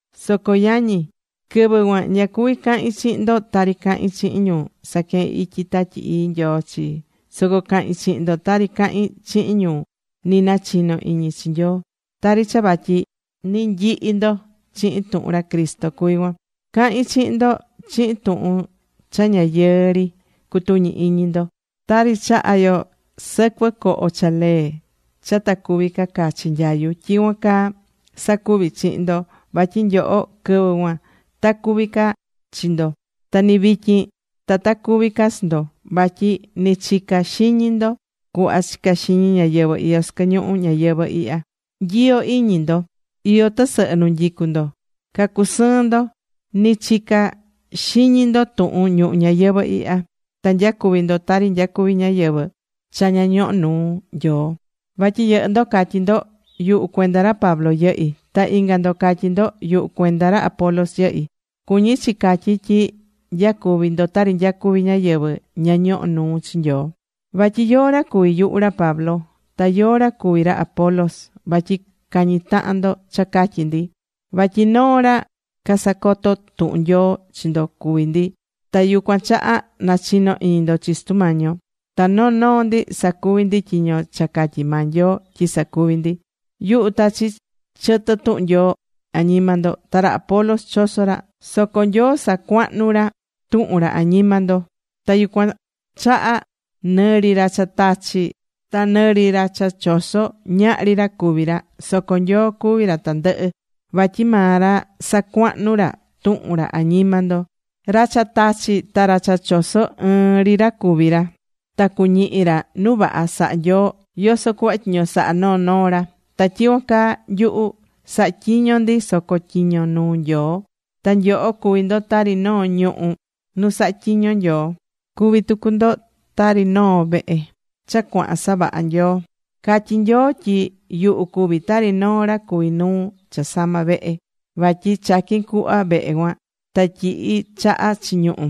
Soco yañi, quɨvɨ cuan ña cuvi̱ cahin chihin ndo tari cahín chihin ñu saquehén ityi Tatyi Ii Nyoo chi, soco cahi̱n chihin ndo tari cahín chihin ñu ni nachino iñi chi Nyoo, tari cha vatyi ni nyihi ndo chihin tuhun ra Cristo cuví cuan. Cahi̱n chihin ndo chihin tuhun cha ña yɨɨ ri cutuñi iñi ndo. Tari chahá yo sɨcuɨ coho cha lee cha ta cuvi ca cachi nyayu, tyicuan caa sacuví chihin ndo. Vatyi nyoho, quɨvɨ cuan ta cuvi ca chi ndo. ¡Ta ni vityin ta ta cuvi ca chi ndo! Vatyi ni chicá ca xiñi ndo cuhva chicá xiñi ñáyɨvɨ iyó sɨquɨ ñuhu ñayɨvɨ̱ ihya. Nyiyó iñi ndo. Iyó tɨsɨhɨ nu nyicú ndo. Cacusɨɨn ndo. Ni chicá ca xiñi ndo tuhun ñuhu ñayɨvɨ̱ ihya. Ta nyacuví ndo tari nyacuví ñáyɨvɨ cha ña ñohó nuu Nyoo. Vatyi yɨhɨ́ ndo catyí ndo: “Yuhu cuenda ra Pablo yɨhí.” Ta inga ndo catyí ndo: “Yuhu cuenda ra Apolos yɨhí.” Cuñí chi catyí tyi nyacuví ndo tari nyacuví ñáyɨvɨ ña ñohó nuu chi Nyoo. Vatyi ¿yóó ra cuví yuhu, ra Pablo? Ta ¿yóó ra cuví ra Apolos? vatyi cañí tahan ndo cha catyi ndi. Vatyi noo ra casacotó tuhun Nyoo chi ndo cuví ndi. Ta yucuan chaha nachino iñi ndo chi Sutu Mañi yo. Ta noo noo ndi sacuví ndi tyiño cha catyi̱ maa Nyoo tyi sacuvi ndi. Yuhu tachi̱ chɨtɨ tuhun Nyoo añima ndo. Ta ra Apolos chosó ra. Soco Nyoo sacuahnu̱ ra tuhun ra añima ndo. Ta yucuan chaha nɨ ri ra cha tachí ta nɨ ri ra cha chosó, ñahri ra cuví ra. Soco Nyoo cuví ra tandɨhɨ. Vatyi maa ra sacuahnú ra tuhun ra añima ndo. Ra cha tachí ta ra cha chosó, ɨɨn ri ra cuví ra. Ta cuñihi ra nu vaha sahá Nyoo yoso cuhva tyiño sahá noo noo ra. Ta tyicuan caa nyuhu, sahatyiñó ndi soco tyiño nuu Nyoo. Ta nyoho cuví ndo tari noo ñuhú nu sahá tyiño Nyoo. Cuví tucu ndo tari noo vehe cha cuahán savaha Nyoo. Catyi̱ Nyoo tyi yuhu cuví tari noo ra cuví nuu cha sama vehe. Vatyi chaqui̱n cuhva vehe cuan ta tyihi̱ chaha chi ñuhú.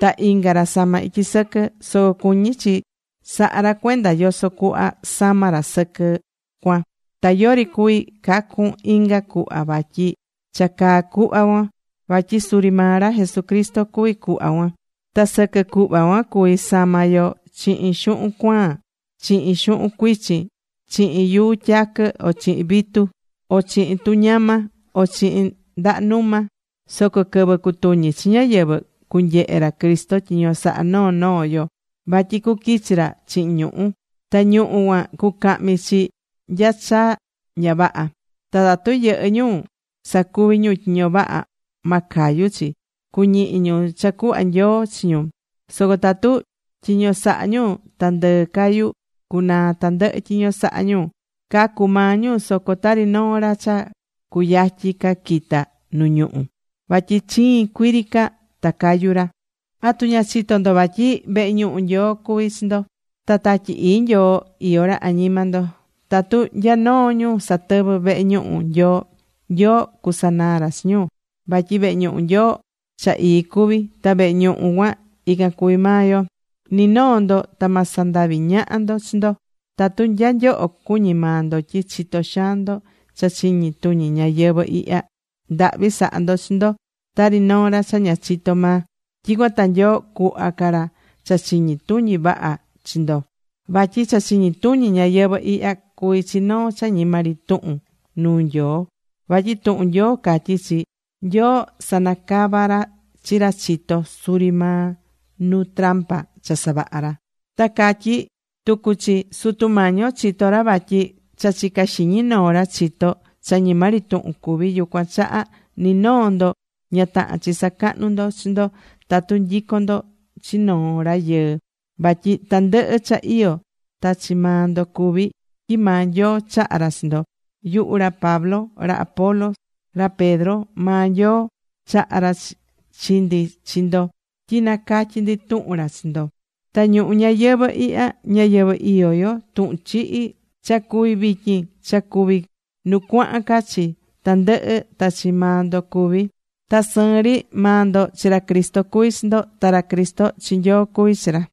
Ta inga ra samá ityi sɨquɨ. Soco cuñí chi sahá ra cuenda yoso cuhva samá ra sɨquɨ cuan. Ta yori cuví cacun inga cuhva vatyi cha caá cuhva cuan. Vatyi suri maa ra Jesucristo cuví cuhva cuan. Ta sɨquɨ cuhva cuan cuví sama yo chihin xuhun cuaan, chihin xuhun cuichin, chihin yuu tyaquɨ, o chihin vitu, o chihin tuñama o chihin ndaha numa. Soco quɨvɨ cutuñi chi ñáyɨvɨ, cunyehe ra Cristo tyiño saha̱ noo noo yo. Vatyi cuquichi ra chihin ñuhu̱. Ta ñuhu̱ cuan cucahmi chi nya cha ña vaha. Ta tatu yɨhɨ́ ñu sacuvi̱ ñu tyiño vaha, ma cayu chi. Cuñihi ñu cha cuhva Nyoo chi ñu. Soco tatu tyiño sahá ñu ta ndɨɨ cayu, cunaa tandɨhɨ tyiño sahá ñu. Cacu maa ñu soco tari noo ra cha cuyatyi ca quita nu ñuhu̱. Vatyi chiin cuii ri ca ta cayu ra. ¿Atu ña chitó ndo vatyi vehe ñuhu Nyoo cuví chi ndo, ta Tatyi Ii Nyoo iyó ra añima ndo? Tatu nya noo ñu satɨvɨ́ vehe ñuhu Nyoo, Nyoo cusanaa ra chi ñu, vatyi vehe ñuhu Nyoo, cha ii cuví. Ta vehe ñuhu cuan ican cuví maa yo. Ni noo ndo ta ma sandavi ñaha ndo chi ndo. Tatu nya nyoho cuñí maa ndo tyi chitó xaan ndo cha chiñi tuñi ñayɨvɨ̱ ihya, ndahvi sa̱ha ndo chi ndo tari noo ra cha ña chitó maa. Tyicuan ta Nyoo cuhva ca ra cha chiñi tuñi vaha chi ndo. Vatyi cha chiñi tuñi ñayɨvɨ̱ ihya cuví chi noo cha ñima ri tuhun nuu Nyoo. Vatyi tuhun Nyoo catyí chi: “Nyoo sanacavá ra chi ra chitó, suri maa nu trampa cha savaha̱ ra.” Ta catyí tucu chi: “Sutu Mañi yo chitó ra vatyi cha chicá xiñi noo ra chitó, cha ñima ri tuhun cuví.” Yucuan chaha ni noo ndo ña tahán chi sacahnú ndo chi ndo tatu nyicón ndo chi noo rayɨɨ. Vatyi tandɨhɨ cha iyó ta chi maa ndo cuví, tyi maa Nyoo chaha̱ ra chi ndo. Yuhu ra Pablo, ra Apolos, ra Pedro, maa Nyoo chaha̱ ra chi ndi chi ndo tyi nacatyí ndi tuhun ra chi ndo. Ta ñuhu ñayɨvɨ̱ ihya, ñayɨvɨ̱ iyó yo, tuhun chihi, cha cuví vityin, cha cuvi nu cuahan ca chi, tandɨhɨ ta chi maa ndo cuví. Ta sɨɨn ri, maa ndo, chi ra Cristo cuví chi ndo, ta ra Cristo, chi Nyoo cuví chi ra.